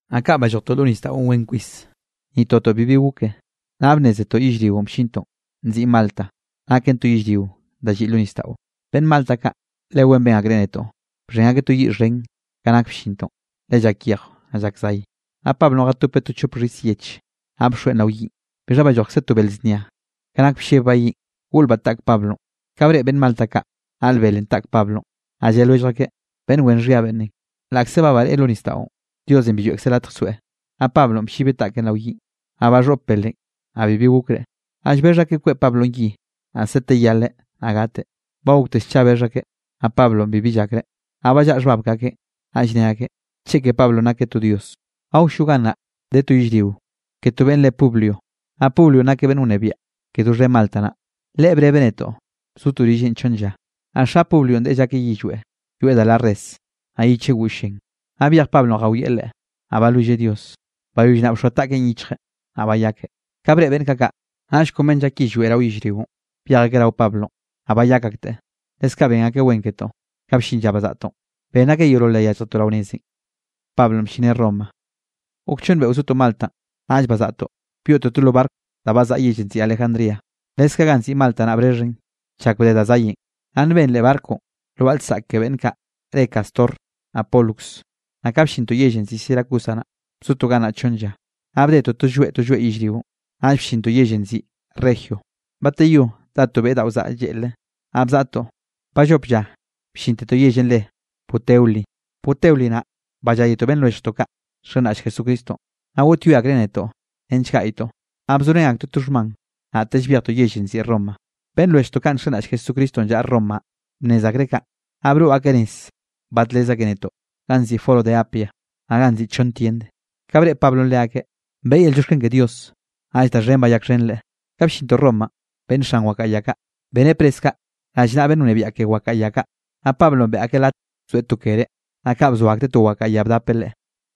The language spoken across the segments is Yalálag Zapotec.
Naꞌ kaꞌ ballojtoꞌ lo nisdaꞌon wen kwis, ni totoꞌ bibi goke. Naꞌ bnnézetoꞌ yellrionꞌ bllintoꞌn nziꞌn Malta, naken to yellrio da lliꞌ lo nisdaꞌo. Beꞌnn Malta kaꞌ le wen ben akreꞌ netoꞌ, bxhen akeꞌ to yiꞌ xhen ka nak bllintoꞌn, le llak yejw, naꞌ llak zay. Naꞌ Pablonꞌ jatopeꞌ to chop xhis yeꞌche, naꞌ bxoeꞌn rao yiꞌn, bixha ballojkze to bel znia, ka nak bllebbaꞌ yiꞌn, goꞌlbaꞌ taꞌk Pablonꞌ. Ka breꞌe beꞌnn Malta kaꞌ naꞌl belenꞌ taꞌk Pablonꞌ, naꞌ lle lwellj akeꞌ: —Beꞌnn wen xhia beꞌnnenꞌ, laꞌkze ba bareꞌe lo nisdaꞌon, Diosenꞌ bi lloeꞌkzeꞌ latj soeꞌ. Naꞌ Pablonꞌ bllibeꞌ taꞌkeꞌn rao yiꞌn, naꞌ baxhoꞌp belenꞌ, naꞌ bibi gokreꞌ. Naꞌ llbexh akeꞌ kweꞌ Pablonꞌ yi, naꞌ sete yaleꞌ naꞌ gateꞌ. Ba gokte scha bexh akeꞌ, naꞌ Pablonꞌ bibi llakreꞌ, naꞌ ballaꞌa xhbab ke akeꞌn. Naꞌll ne akeꞌ, cheke Pablonꞌ nakeꞌ to dios. Awllo gannaꞌ de to yellrio ke to beꞌnn re Publio, naꞌ Publionꞌ nakeꞌ beꞌnn wnebiaꞌ ke doxhen Malta naꞌ. Leꞌe brebeꞌ netoꞌ, bzotoꞌ rilleꞌn chonn lla. Naꞌ xa Publionꞌ deꞌe llakeꞌ yillweꞌ, yoeꞌ da la res, naꞌ yicheꞌ goll llen. Naꞌ byej Pablonꞌ jawieꞌ leꞌe, naꞌ balwilleꞌ Dios. Bayoll naꞌ bxoa taꞌkeꞌn yichjeꞌn, naꞌ bayakeꞌ. Ka breꞌe beꞌnn kaꞌ kaꞌ, naꞌll kon beꞌnn llak yillweꞌ rao yellrionꞌ, byej akeꞌ rao Pablonꞌ, naꞌ bayak akteꞌ. Leskaꞌ ben akeꞌ wen ketoꞌ, ka bllin lla bazaꞌtoꞌn, benn akeꞌ yeolol da yálljetoꞌ rao nezenꞌ. Gok chonn beꞌo zotoꞌ Maltanꞌ, naꞌll bazaꞌtoꞌ byoꞌtoꞌ to lo barco da bzaꞌa yellenꞌ nziꞌi Alejandría, leskaꞌ ganꞌ nziꞌi Malta, naꞌ brexhen chak bde da zayenꞌ. Naꞌ nben leꞌ barconꞌ lwaꞌa lsaꞌk ke beꞌnn kaꞌ re Cástor naꞌ Pólux. Naꞌ ka bllintoꞌ yell nziꞌi Siracusa naꞌ, bzotoꞌ gannaꞌ chonn lla. Naꞌ bdetoꞌ to lloeꞌ, to lloeꞌ yellrionꞌ, naꞌll bllintoꞌ yellenꞌ nziꞌi Regio. Bateyó dá to beꞌ daꞌo zaꞌa lleꞌlre, naꞌ bzaꞌtoꞌ, ballop lla bllintetoꞌ yellenꞌ re Puteoli. Puteoli naꞌ balláyetoꞌ beꞌnn lwelljtoꞌ kaꞌ nxenraꞌll Jesucristonꞌ, naꞌ goꞌtyoe akreꞌ netoꞌ nench gaꞌytoꞌ. Naꞌ bzorén aktoeꞌ to xhman, naꞌtell byejtoꞌ yellenꞌ nziꞌi Roma. Beꞌnn lwelljtoꞌ kaꞌ nxenraꞌll Jesucristonꞌ llaꞌa Romanꞌ, bnnez akreꞌ kaꞌ, naꞌ broꞌ akeꞌ nez badlez akeꞌ netoꞌ ganꞌ nziꞌi Foro de Apia, naꞌ ganꞌ nziꞌi Chonn Tiend. Ka breꞌe Pablonꞌ leakeꞌ, beꞌe yel llioxken ke Dios, naꞌll da xhen bayakxhenreꞌ. Ka bllintoꞌ Romanꞌ, beꞌnn xan wakaꞌa ya kaꞌ, beneꞌ pres kaꞌ rallnaꞌa beꞌnn wnebiaꞌ ke wakaꞌa ya kaꞌ. Naꞌ Pablonꞌ beꞌe akeꞌ latj bzoeꞌ to kere, naꞌ kaꞌ bzo akteꞌ to wakaꞌa ya bdapeꞌ leꞌe.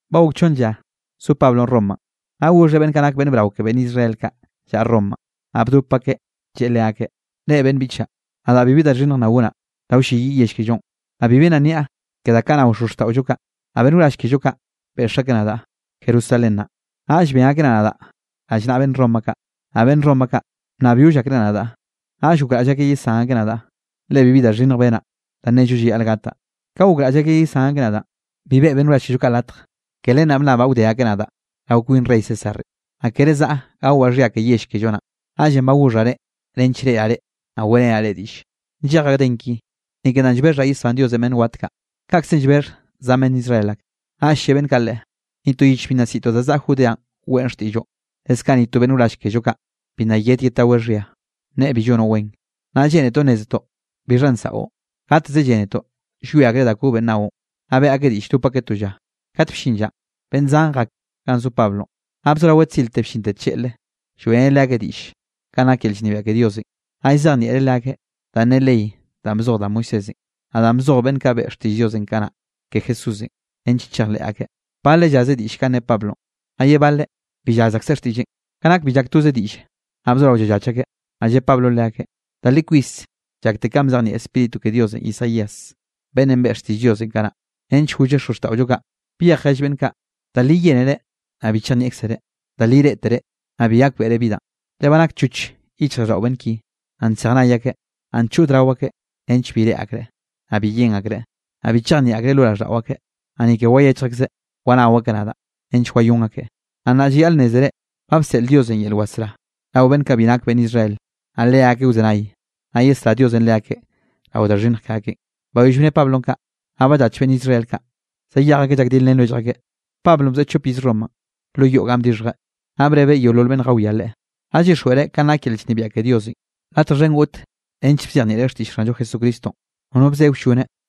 Ba gok chonn lla zo Pablonꞌ Romanꞌ, naꞌ goxheꞌ beꞌnn kaꞌ nak beꞌnn brao ke beꞌnn Israel kaꞌ llaꞌa Romanꞌ, naꞌ bdop akeꞌ lleꞌe leakeꞌ: —Reꞌ beꞌnn biꞌchaꞌ, nadaꞌ bibi da xhinnj nna gonaꞌ da wlleyiꞌ yell kellonꞌ, naꞌ bibi nna nniaꞌ ke da kaꞌ nao xozxtaꞌollo kaꞌ, naꞌ beꞌnn wrall kello kaꞌ beꞌx akeꞌ nadaꞌ Jerusalén naꞌ, naꞌll ben akeꞌ nadaꞌ rallnaꞌa beꞌnn Roma kaꞌ. Naꞌ beꞌnn Roma kaꞌ, bnnabyoll akreꞌ nadaꞌ, naꞌll gokraꞌll akeꞌ yesán akeꞌ nadaꞌ, le bibi da xhinnj benaꞌ da nello llayaꞌl gataꞌ. Ka gokraꞌll akeꞌ yesán akeꞌ nadaꞌn, bi beꞌe beꞌnn wrall kello kaꞌ latj. Ke len naꞌ bnnabaꞌ wde akeꞌ nadaꞌ rao kwin rey Césarenꞌ, naꞌ kere zaꞌa gawaꞌ xhia ke yell kello naꞌn. Naꞌllenꞌ ba goxhaꞌ reꞌ nench reꞌraꞌ reꞌ, naꞌ weꞌrenaꞌ reꞌ diꞌlle. Nllejaꞌ gden ki, ni ke danꞌ llbexhaꞌ yesbán Diosenꞌ beꞌnn wat kaꞌ, kaꞌkze llbexh zan beꞌnn Israel ak. Naꞌll lle beꞌnn kaꞌ leꞌe: —Ni to yich bi nna siꞌtoꞌ da zaꞌa Judeanꞌ weꞌn xtiꞌlloꞌ, leskaꞌ ni to beꞌnn wrall kello kaꞌ, bi nna yed yedtaweꞌ xhia, nneꞌe bi llonoꞌ wen. Naꞌ lleꞌnetoꞌ nnézetoꞌ bixhanꞌ nsaꞌo, gateze llénetoꞌ llwie akreꞌ da kobenꞌ naoꞌn. Naꞌ beꞌe akeꞌ diꞌll dop akeꞌ to lla. Kat bllin llanꞌ, beꞌnn zan jak ganꞌ zo Pablonꞌ. Naꞌ bzoraweꞌ tzirte bllinte tlleꞌle lloeꞌreneꞌ leakeꞌ diꞌll kanꞌ nak yel llnebiaꞌ ke Diosenꞌ, naꞌ llzejnieꞌreꞌ leakeꞌ danꞌ ne ley danꞌ bzoj da Moisésenꞌ, naꞌ danꞌ bzoj beꞌnn kaꞌ beꞌe xtiꞌll Diosenꞌ kanaꞌ ke Jesús, nench chejleꞌ akeꞌ. Baleꞌ llaze diꞌll kanꞌ ne Pablonꞌ, naꞌ ye baleꞌ bi llaz akseꞌ xtiꞌlleꞌn. Ka nak bi llak toze diꞌlle, naꞌ bzorao llallach akeꞌ. Naꞌ lle Pablonꞌ leakeꞌ: —Da li kwis llakte kanꞌ bzejnieꞌ Spíritu ke Diosenꞌ Isaías beꞌnnenꞌ beꞌe xtiꞌll Diosenꞌ kanaꞌ, nench golleꞌ xozxtaꞌollo kaꞌ: Byej jell beꞌnn kaꞌ: Da li yénere, naꞌ bi chejnieꞌkzere, da li reꞌtere, naꞌ bi gakbeꞌre bi danꞌ. Le ba nakchoch yichjraꞌlldaꞌo beꞌnn ki, naꞌ nsej nay akeꞌ, naꞌ nchod rao akeꞌ, nench bi reꞌe akreꞌ, naꞌ bi yen akreꞌ, naꞌ bi chejnieꞌ akreꞌ lo raꞌlldaꞌo akeꞌ, naꞌ ni ke wayechj akseꞌ wanao akeꞌ nadaꞌ nench wayón akeꞌ. Naꞌ nnaꞌ llayaꞌl nnézere, ba bseꞌl Diosenꞌ yel wasrá rao beꞌnn kaꞌ bi nak beꞌnn Israel, naꞌ leakeꞌ wzenay, naꞌ yesrá Diosenꞌ leakeꞌ rao da xhinnj ke akeꞌn. Bayoll bne Pablonꞌ kaꞌ, naꞌ ballach beꞌnn Israel kaꞌ, zayej akeꞌ llak dilrén lwellj akeꞌ. Pablonꞌ bzoeꞌ chop iz Romanꞌ lo yoꞌ ga bdixhjeꞌ, naꞌ brebeꞌ yeolol beꞌnn jawiá leꞌe. Naꞌ llyixjweꞌreꞌ kanꞌ nak yel llnebiaꞌ ke Diosenꞌ. Latj xhen goꞌt nench bzejnieꞌreꞌ xtiꞌll Xanllo Jesucristonꞌ, nono bze wlloneꞌ.